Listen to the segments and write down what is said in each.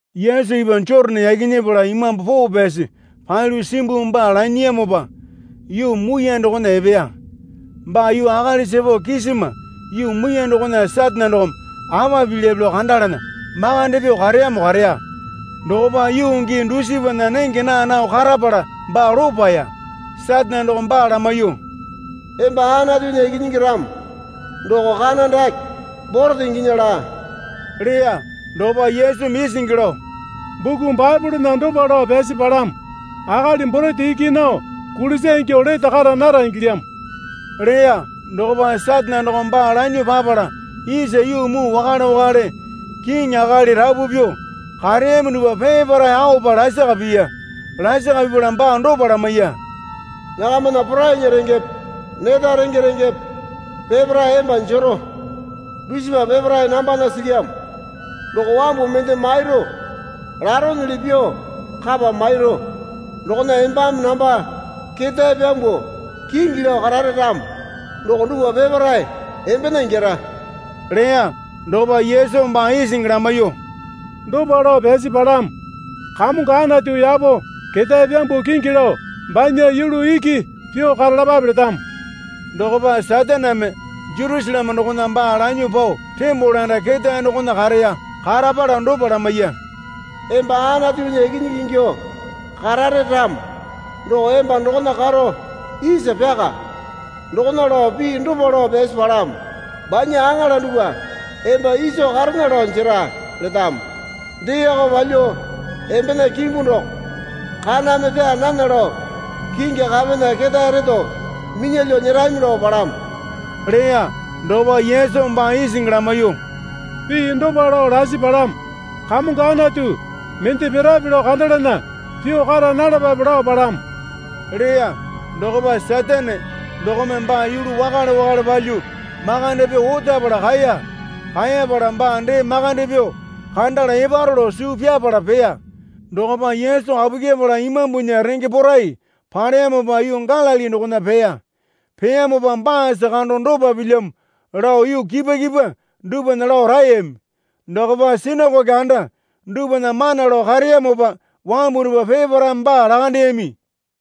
Yesu ipwa Jotane yaki nyepala Imambu Poo Pyasi palyuo simbuo baa lanyiyamopa yuu muiyane dokona epeya. Baa yuu akalisa pao kisima yuu muiyane dokona Satane dokome apa pilyape lao kandalana makande pyuo kareyamo kareya. Dokopa yuu gii dusipana nenge naa nao karapala baa lopaya. Satane dokome baa lamaiyuo, Emba Anatunya Ikinyingi ramo doko kana dake borete inginya laa, leya. Dokopa Yesumi isingi lao, Buku Baepolena dopa lao pyasi palamo. Akali borete iki nao kulisa ingyuo lete kara nara ingilyamo leya. Dokopa Satane dokome baa lanyuo papala isa yuu muu wakale wakale kiŋi akali rapu pyuo kareyami dupwa peparae aopa lasaka piya. Lasaka pipala baa dopa lamaiya. Nakamana porainya rengepe neta renge rengepe peparae emba jero. Dusipa peparae nambana silyamo doko wambu mende mairu laronyili pyuo kapa mairu. Dokona embame namba ketae pyambuo kingi lao karare ramo doko dupwa peparae embena ingyara leya. Dokopa Yesumi baa isingi lamaiyuo, Dopa lao pyasi palamo. Kamongo Anatu yapo ketae pyambuo kingi lao, banya yulu iki pyuo karalapape letamo. Dokopa Sataneme Jerusaleme dokona baa lanyuo pao tembole anda ketae dokona kareya. Karapala dopa lamaiya. Emba Anatunya Ikinyingi ingyuo karare ramo doko emba dokona karo isa pyaka. Dokona lao pii dopa lao pyasi palamo. Banya aŋala dupwa emba iso karena lao jera letamo. Deeko palyuo embena kimbu doko kaname pyaa nana lao kingi kapena ketae reto minyalyuo nyerami lao palamo, leya. Dokopa Yesumi baa isingi lamaiyuo, Pii dopa lao lasi palamo. Kamongo Anatu mende pirape lao kandalana pyuo kara nalapape lao palamo, leya. Dokopa Satane dokome baa yulu wakale wakale palyuo makande pyuo otapala kaeya. Kaeyapala baa dee makande pyuo kandala eparo lao suu pyapala peya. Dokopa Yesu kapu kyepala Imambunya renge porai paleyamopa yuu Galili dokona peya. Peyamopa baasa kando dopa pilyamo lao yuu kipwa kipwa dupwana lao raeyami. Dokopa sinakoke anda dupwana mana lao kareyamopa wambu dupwa peparaeme baa lakandeyami.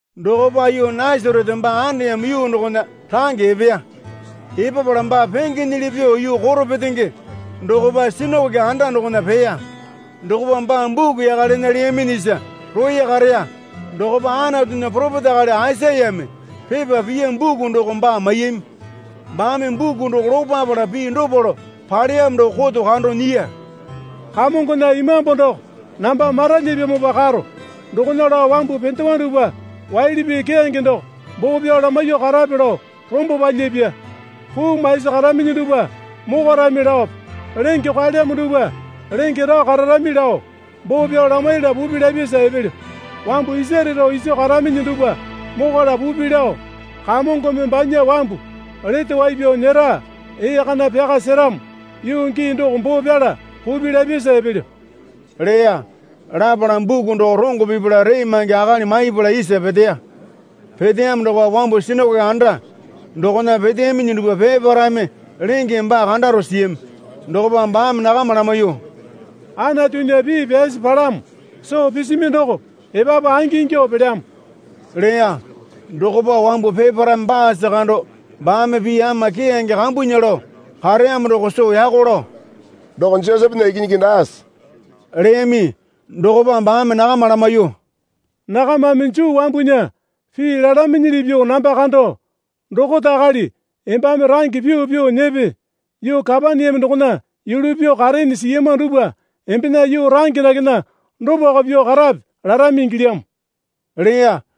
Dokopa yuu Nasarete baa andeyamo yuu dokona range epeya. Epapala baa pengenyili pyuo yuu koro petenge dokopa sinakoke anda dokona peya. Dokopa baa buku yaka lena leyaminyisa roya kareya. Dokopa Anatunya poropeta akali Aisayame pepa piya buku doko baa maiyami. Baame buku doko lopapala pii dopa lao paleyamo doko koto kando nyiya. Kamongona Imambu doko namba maralyipyamopa karo, dokona lao wambu pendewa dupwa waili pii keyange doko boo pyao lamaiyuo karape lao rombo palyapya. Puu maisi karaminyi dupwa mokwarami laope lenge kwaelyamo dupwa lenge rao kararami lao boo pyao lamaiyala pupi lapyasa epelyo. Wambu isare rao iso karaminyi dupwa mokwala pupi lao Kamongome banya wambu lete wai pyao nyera ee kana pyaka seramo yuu gii doko boo pyala pupi lapyasa epelyo leya. Lapala buku doko rongo pipala ree maingi akali maipala isa peteya. Peteyamo dokopa wambu sinakoke anda dokona peteyaminyi dupwa peparaeme lengeme baa kandaro siyami. Dokopa baame nakama lamaiyuo, Anatunya pii pyasi palamo soo pisimi doko epapu angingyuo pelyamo leya. Dokopa wambu peparaeme baasa kando baame pii ama keyange kambunya lao kareyamo doko soo yako lao, Doko Josepena ikinyingi daase? leyami. Dokopa baame nakama lamaiyuo, Nakamame Juu wambunya pii lalaminyili pyuo namba kando, Dokota akali embame range pyuo pyuo nyepe, yuu Kapaneame dokona yulu pyuo kareene siyama dupwa embena yuu range dakena dopako pyuo karape, larami ingilyamo, leya.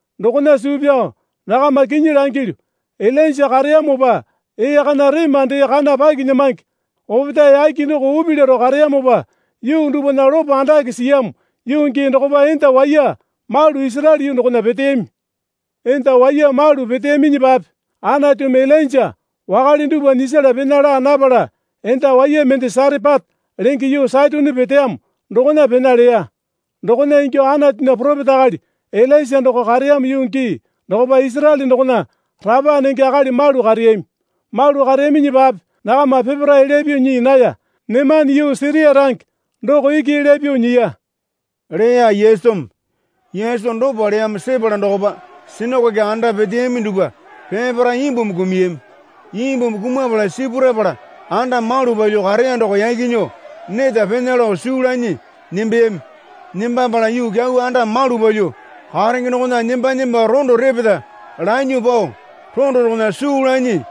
Dokona suu pyao nakama kinyi langilyu, Ilainja kareyamopa ee kana rema dee kana pakinyamange opetae yake doko upi laro kareyamopa yuu dupwana lopo andake siyamo yuu gii dokopa enda waiya malu Isaraele yuu dokona peteyami. Enda waiya malu peteyaminyipape Anatumi Ilainja wakale dupwa nyisala pena laa napala enda waiya mende Sarepata lenge yuu Saitone peteyamo dokona pena leya. Dokona ingyuo Anatunya poropeta akali Ilaisa doko kareyamo yuu gii dokopa Isaraele dokona rapa nenge akali malu kareyami. Malu kareyaminyipape nakama peparae elya pyuo nyii naya. Nemane yuu Siria range doko iki elya pyuo nyiya, leya Yesumi. Yesu dopa leyamo sepala dokopa sinakoke anda peteyami dupwa peparae imbumi kumuyami. Imbumi kumapala sipurapala anda malu palyuo kareya doko yaki nyuo neta pena lao suu lanyi nembeyami. Nembapala yuu kyau anda malu palyuo karenge dokona nemba nemba rondo repeta lanyuo pao rondo dokona suu lanyi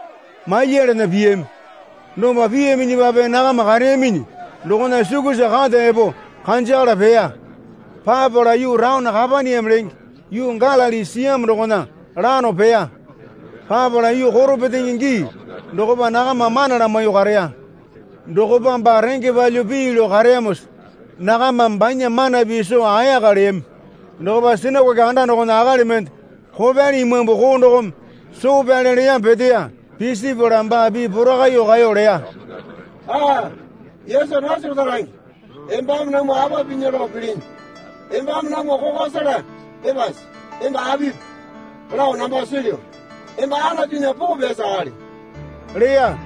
malyalana piyami. Dopa piyaminyipape nakama kareyaminyi dokona sukusa kata epo kanjakala peya. Papala yuu taone Kapaneame lenge yuu Galili siyamo dokona lano peya. Papala yuu koro petenge gii dokopa nakama mana lamaiyuo kareya. Dokopa baa renge palyuo pii lao kareyamosa nakamame banya mana pii soo ayaka leyami. Dokopa sinakoke anda dokona akali mende kopyali imambu koo dokome soo pyale leyamo peteya. Pisipala baa pii porakaiyuo kaeyo leya. Aa, Yesu Nasarete range embame namwa apa pinya lao pilinyi? Embame namwa kokwa sela epase? Emba apipi lao namba silyu. Emba Anatunya Poo Pyasi Akali, leya.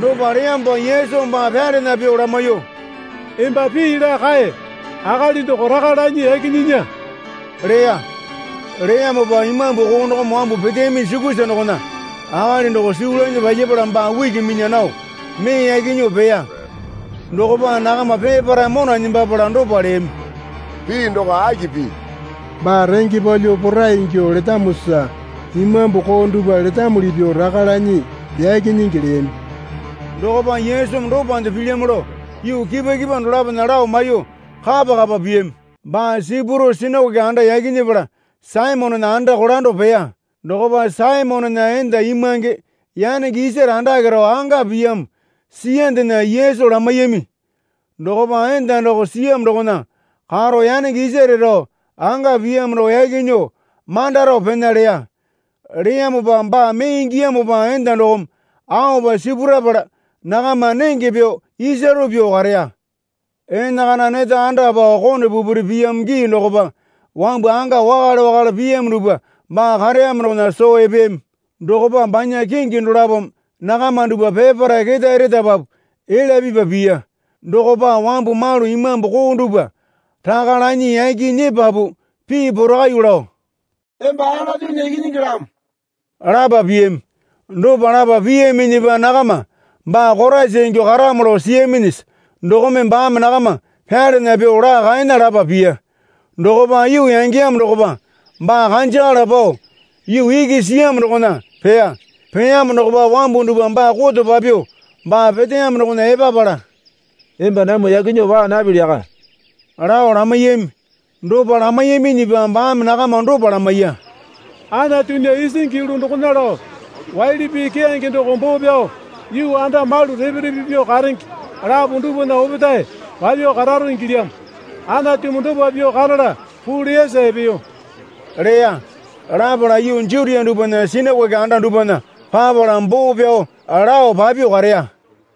Dopa leyamopa Yesumi baa pyalana pyuo lamaiyuo, Emba pii laa kae. Akali doko raka lanyi yaki nyinya, leya. Leyamopa imambu koo dokome wambu peteyaminyi sukusa dokona akali doko suu lanyi palyapala baa uki minya nao mee yaki nyuo peya. Dokopa nakama peparae mona nembapala dopa leyami. Pii doko aki pii? Baa renge palyuo porai ingyuo letamosa imambu koo dupwa letamuli pyuo raka lanyi yaki nyingi leyami. Dokopa Yesumi dopande pilyamo lao yuu kipwa kipwa dolapona lao maiyuo kapa kapa piyami. Baa sipuro sinakoke anda yaki nyepala Saimonena anda kolando peya. Dokopa Saimonena enda imwange yanenge isare andake rao anga piyamo siyandena Yesu lamaiyami. Dokopa enda doko siyamo dokona karo yanenge isare rao anga piyamo doko yaki nyuo manda rao pena leya. Leyamopa baa mee ingiyamopa enda dokome aopa sipurapala nakama nenge pyuo isaro pyuo kareya. Enakana neta anda pao kone pupuri piyamo gii dokopa wambu anga wakale wakale piyamo dupwa baa kareyamo dokona soo epeyami. Dokopa banya kingi dolapome nakama dupwa peparae ketae retapapu elya pipa piya. Dokopa wambu malu imambu koo dupwa raka lanyi yaki nyepapu pii porakaiyuo lao, Emba Anatunya Ikinyingilamo, lapa piyami. Dopa lapa piyaminyipa nakama baa Koraisa ingyuo karamo lao siyaminyisa dokome baame nakama pyalana pyuo laa kaena lapa piya. Dokopa yuu yangeyamo dokopa baa kanjakala pao yuu iki siyamo dokona peya. Peyamo dokopa wambu dupwa baa koto papyuo baa peteyamo dokona epapala, Emba namwa yaki nyuo paa napili yaka, lao lamaiyami. Dopa lamaiyaminyipa baame nakama dopa lamaiya. Anatunya isingi yulu dokona lao waili pii keyange doko boo pyao yuu anda malu repe repe pyuo karenge lapo dupwana opetae papyuo kararo ingilyamo. Anatumi dopa pyuo karala puu leyasa epeyo leya. Lapala yuu Jutia dupwana sinikoke anda dupwana papala boo pyao lao papyuo kareya.